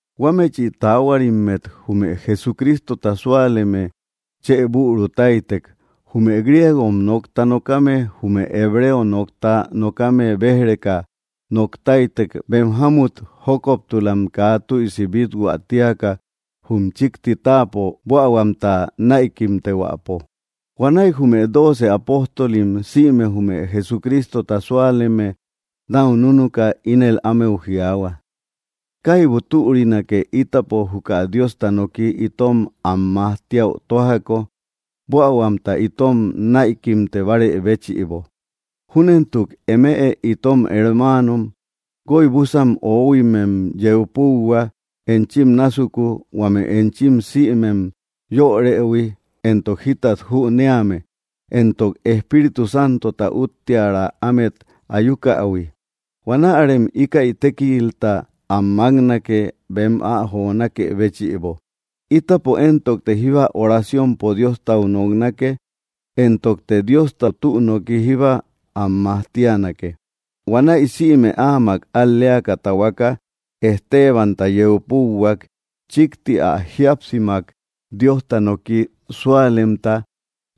Huámechi taáhuarimmet jume Jesucrístota súaleme chë bürutáitek, jume griego nokta nókame jume hebreo nokta nokame béj‑reka noktáitek bem jámut jókoptulam kaa tüisi bíthuä tíaka jum chikti táapo buähuamta näikimtehuäpo. Huanäi jume dóoce apóstolim sïme jume Jesucrístota súaleme nau núnuka ínel ámeu jiaahua: —Kaibu türinake ítapo juka Diosta noki itom am majtíäu tójako, buähuamta itom näikimtebare béchïbo. Júnentuk, eme itom hermáanom, guoibusan oóhuimem yeu púuhua enchim násuku, huame enchim sïmem yörëhui éntok jítat jünéame, éntok Espíritu Santota útteara ámet ayúkähui. Huanärem íkäi tékilta am máknake bem ä jonákë béchïbo. Ítapo éntokte jíba oraciompo Diostau noknake, éntokte Diosta tü noki jíba am majtíanake. Huanäi sïme áamak al‑léaka tahuaka Estebanta yeu púuhuak, chikti ä jíapsimak Diosta noki súalemta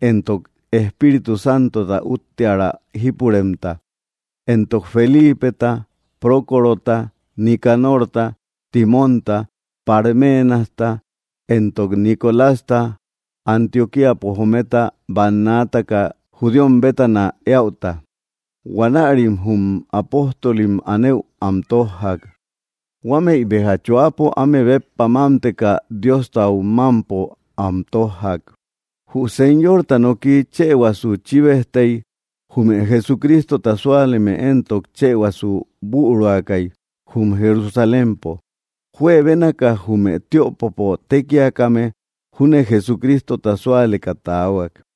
éntok Espíritu Santota útteara jípuremta, éntok Felípeta, Prócorota, Nicanorta, Timonta, Parménasta, éntok Nicolasta Antioquíapo jometa bannaataka judíom bétana éäuta. Huanärim jum apóstolim anëu am tójjak, huamei béja choapo áme béppa mámteka Diostau mampom am tojjak. Jü Señorta noki chëhuasu chíbejtei, jume Jesucrístota súaleme éntok chëhuasu büruakai jum Jerusalémpo. Juebénaka jume tiöpopo tékiakame júne Jesucrístota súaleka tahuak.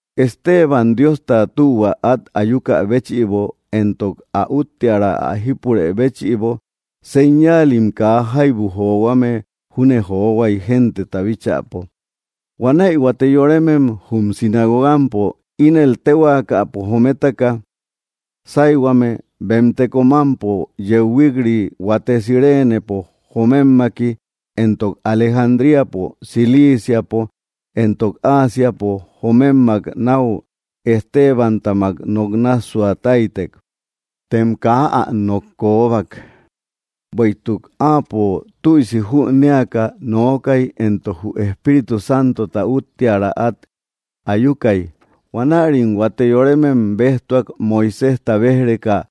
Esteban Diosta tühua at ayúkä béchïbo, éntok ä útteara ä jípurë béchïbo, señáalim kaa jaibu johuame júne johuai genteta bíchäpo. Huanäi huate yorémem, jum sinagogampo ínel téhuaakapo jométaka: Sáihuame bem teko mámpo yeu huik‑ri, huate Cireenepo jomemmaki, éntok Alejandríapo, Ciliiciapo, éntok Ásiapo jomemmak náu Estebantamak nok nássua táitek. Tem kaa ä nok kóbbak, bueïtuk áapo tüisi jünéaka nookay, éntok jü Espíritu Santota útteara at ayúakai. Huanärim huate yorémem béjtuak Moiséjta béj‑reka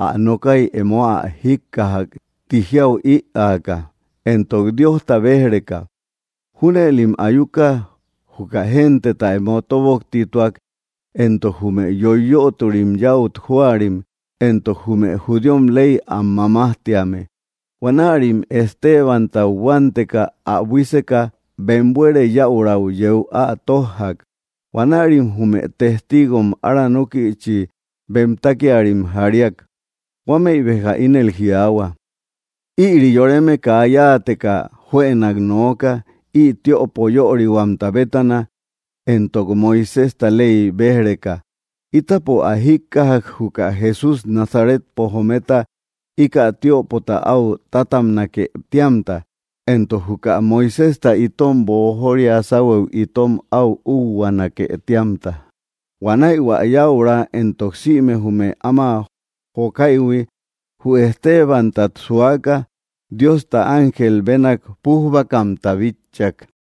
ä nokái emo ä jíkkajak ti jiau ïaaka, éntok Diosta béj‑reka. Júnëlim ayuka juka genteta emo tóboktituak, éntok jume yoiyötori yäut jóarim, éntok jume judíom ley am mamájtíame. Huanärim Estebantau hüanteka, ä buíseka, bem buere yäurau yéu ä tójjak. Huanärim jume testígom aranókïchi bem tákiarim jaríak. Huámëi béja ínel jiaahua: —Ïri yoreme kaa yáateka juënak nooka ï tiöpo yörihuamta bétana, éntok Moiséjta ley béj‑reka. Ítapo ä jíkkajak juka Jesús Nazaretpo jometa ika tiöpota au tátabnake tíamta, éntok juka Moiséjta itom boojória sáuhuëu itom au úhuanake tíamta. Huanäi hua yäura entok sïme jume áma jokáïhui, jü Estebántat suaka Diosta ángel bénak pújbakamta bitchak.